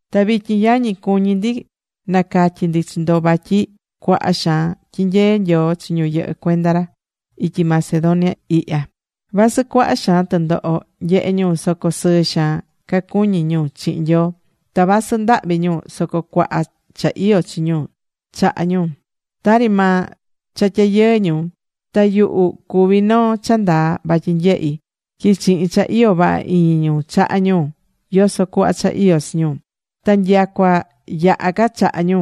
Ta vityin yañi, cuñí ndi nacatyi ndi chi ndo vatyi cuaha xaan tyinyee Nyoo chi ñu yɨhɨ́ cuenda ra, ityi Macedonia ihya. Vasɨ cuaha xaan tɨndoho nyehé ñu, soco sɨɨ xaan ca cuñí ñu chihin Nyoo. Ta vasɨ ndahvi ñu soco cuaha cha iyó chi ñu chahá ñu, tari maa cha tyayɨɨ ñu. Ta yuhu cuví noo cha ndaa vatyi nyehi̱ tyi chihin cha iyó vaha iñi ñu chaha̱ ñu yoso cuhva cha iyó chi ñu. Ta nyacua yaha ca chahá ñu.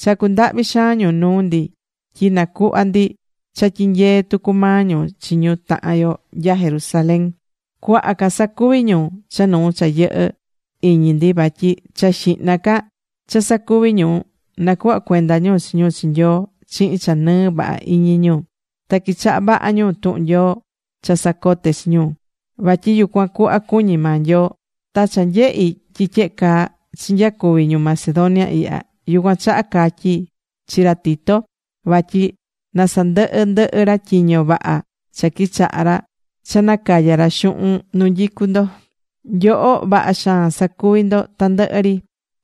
Chacú ndahvi xaan ñu nuu ndi tyi nacuhvá ndi cha tyinyeé tucu maa ñu chi ñu tahan yo nya Jerusalén. Cuaha ca sacuvi̱ ñu cha nuu cha yɨhɨ̱ iñi ndi. Vatyi cha xihna ca cha sacuvi̱ ñu, nacuhva̱ cuenda ñu chi ñu chi Nyoo chihin cha nɨɨ vaha iñi ñu. Ta quichaha̱ vaha ñu tuhun Nyoo cha sacote̱ chi ñu, vatyi yucuan cuhva cuñí maa Nyoo. Ta cha nyehi̱ tyi tyehe caa chinyacuvi ñu Macedonia ihya, yucuan chaha catyi̱ chi ra Tito vatyi na sandɨhɨ ndɨhɨ ra tyiño vaha cha quichaha̱ ra cha nacaya ra xuhun nu nyicú ndo. Nyoho vaha xaan sacuví ndo tandɨhɨ ri.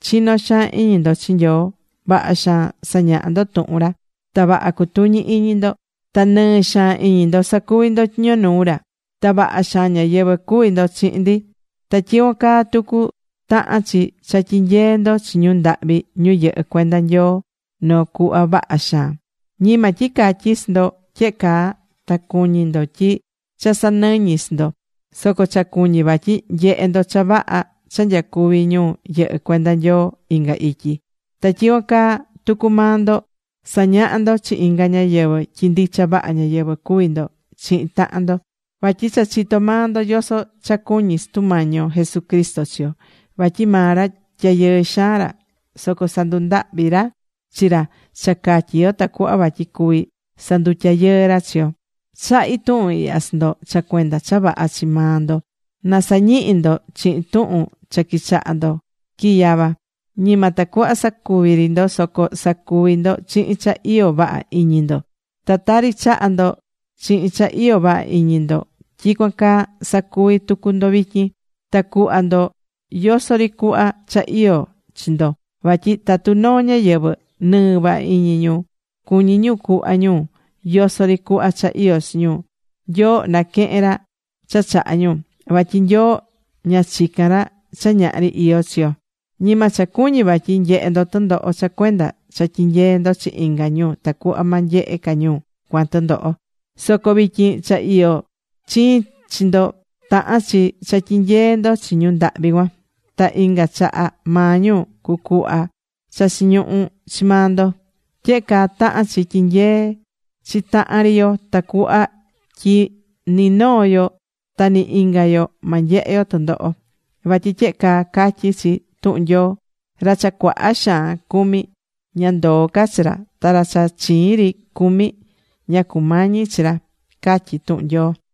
Chinó xaan iñi ndo chi Nyoo. Vaha xaan sañahá ndo tuhun ra. Ta vaha cutuñí iñi ndo. Ta nɨɨ xaan iñi ndo sacuví ndo tyiño nuu ra. Ta vaha xaan ñáyɨvɨ cuví ndo chihin ndi. Ta tyicuan caa tucu tahán chi cha tyinyeé ndo chi ñu ndahvi ñu yɨhɨ́ cuenda Nyoo noo cuhva vaha xaan. Ñima tyi catyí chi ndo tyehe caa ta cuñí ndo tyi cha sanɨñí chi ndo. Soco cha cuñí vatyi nyehé ndo cha vaha cha nyacuví ñu yɨhɨ́ cuenda Nyoo inga ityi. Ta tyicuan caa tucu maa ndo sañahá ndo chi inga ñáyɨvɨ tyi ndicha vaha ñáyɨvɨ cuví ndo chihin tahan ndo. Vatyi cha chitó maa ndo yoso cha cuñí Sutu Mañi yo Jesucristo chi yo. Vatyi maa ra tyayɨɨ xaan ra. Soco sandundahvi̱ ra chi ra cha catyi yo tacuhva vatyi cuví sandutyayɨɨ ra chi yo. Chahí tuhun ihya chi ndo cha cuenda cha vaha chi maa ndo. Na sañihi ndo chihin tuhun cha quichaha̱ ndo quiyava. Ñima tacuhva sacuvi̱ ri ndo, soco sacuvi̱ ndo chihin cha iyó vaha iñi ndo. Ta tari chaha̱ ndo chihin cha iyó vaha iñi ndo, tyicuan caa sa̱cuvi tucu ndo vityin. Ta cu̱hva ndo yoso ri cuhva cha iyó chi ndo. Vatyi tatu noo ñáyɨvɨ nɨɨ vaha iñi ñu, cuñí ñu cuhva ñu yoso ri cuhva cha iyó chi ñu, Nyoo naquehén ra cha chahá ñu. Vatyi Nyoo ña chicán ra cha ñahri iyó chi yo. Ñima cha cuñí vatyi nyehe ndo tɨndoho cha cuenda cha tyinyeé ndo chi inga ñu tacuhva ma nyehe ca ñu cuan tɨndoho. Soco vityin cha iyó chiin chi ndo, tahan chi cha tyinyee ndo chi ñu ndahvi cuan. Ta inga chaha maa ñu cucuhva cha chiñuhú chi maa ndo. Tyehe caa tahán chi tyinyeé chi tahan ri yo tacuhva tyi ninoo yo ta ni inga yo ma nyehe yo tɨndoho. Vatyi tyehe caa catyí chi tuhun Nyoo: “Ra cha cuaha xaan cumí, ña ndoó ca chi ra. Ta ra cha chiin ri cumi, ña cumañí chi ra”, catyí tuhun Nyoo.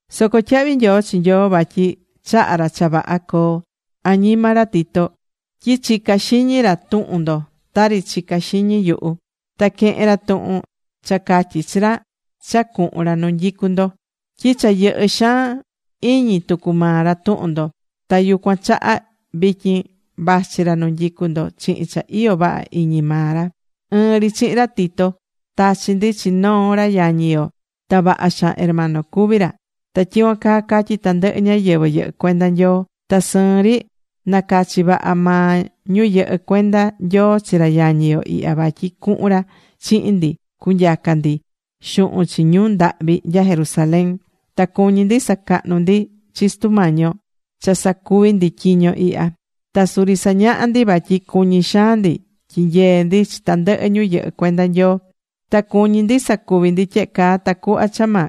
Soco tyahvi nyoo chi Nyoo vatyi chahá ra cha vaha coo añima ra Tito tyi chicá xiñi ra tuhun ndo tari chicá xiñi yuhu. Ta quehén ra tuhun cha catyí chi ra cha cuhun ra nu nyicú ndo. Tyi cha yɨhɨ́ xaan iñi tucu maa ra tuhun ndo. Ta yucuan chaha vityin vachí ra nu nyicú ndo chihin cha iyó vaha iñi maa ra. Ɨɨn ri chihin ra Tito tachí ndi chi noo ra yañi yo. Ta vaha xaan hermano cuví ra, ta tyicuan caa catyí tandɨhɨ ñáyɨvɨ yɨhɨ́ cuenda Nyoo. Ta sɨɨn ri nacachi̱ vaha maa ñu yɨhɨ́ cuenda Nyoo chi ra yañi yo ihya vatyi cuhun ra chihin ndi cunyaca ndi xuhun chi ñu ndahvi nya Jerusalén. Ta cuñí ndi sacahnú ndi chi Sutu Mañi yo cha sacuví ndi tyiño ihya. Ta suri sañahá ndi vatyi cuñi xaan ndi tyinyee ndi chi tandɨhɨ ñu yɨhɨ́ cuenda Nyoo. Ta cuñí ndi sacuví ndi tyehe caa tacuhva cha ma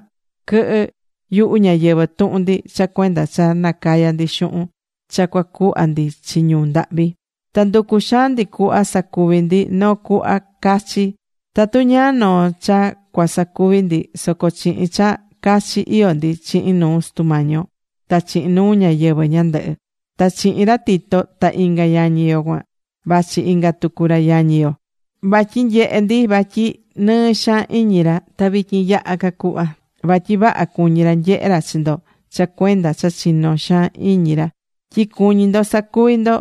quɨhɨ yuhu ñáyɨvɨ tuhun ndi cha cuenda cha nacayá ndi xuhun cha cuacuhva ndi chi ñu ndahvi. Ta nducú xaan ndi cuhva sacuví ndi noo cuhva cachi. Tatu ñáá noo cha cuasacuvi ndi soco chihin cha cachi iyó ndi chihin nuu Sutu Mañi yo ta chihin nuu ñáyɨvɨ ñandɨhɨ. Ta chihin ra Tito ta inga yañi yo cuan, vachí inga tucu ra yañi yo, vatyi nyehé ndi vatyi nɨɨ xaan iñi ra. Ta vityin yaha ca cuhva, vatyi vaha cuñí ra nyehé ra chi ndo cha cuenda cha chinó xaan iñi ra tyi cuñí ndo sacuví ndo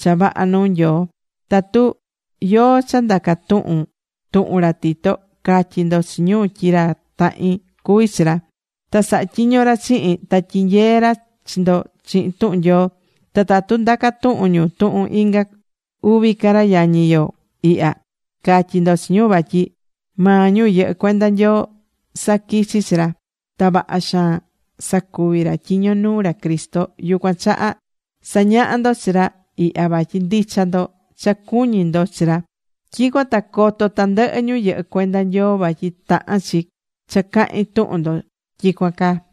cha vaha nuu Nyoo. Tatu yóó cha ndaca tuhun tuhun ra Tito, ca̱tyi ndo chi ñu tyi ra tahin cuví chi ra. Ta sahá tyiño ra chihin, ta tyinyeé ra chi ndo chihin tuhun Nyoo. Ta tatu ndaca tuhun ñu tuhun inga uvi ca ra yañi yo ihya, ca̱tyi ndo chi ñu vatyi maa ñu yɨhɨ́ cuenda Nyoo saquichi̱ chi ra. Ta vaha xaan sacuvi ra tyiño nuu ra Cristo. Yucuan chaha sa̱ñaha ndo chi ra ihya vatyi ndicha ndo cha cuñí ndo chi ra. Tyicuan ta coto tandɨhɨ ñu yɨhɨ́ cuenda Nyoo vatyi tahán chi cha cahín tuhun ndo tyicuan caa.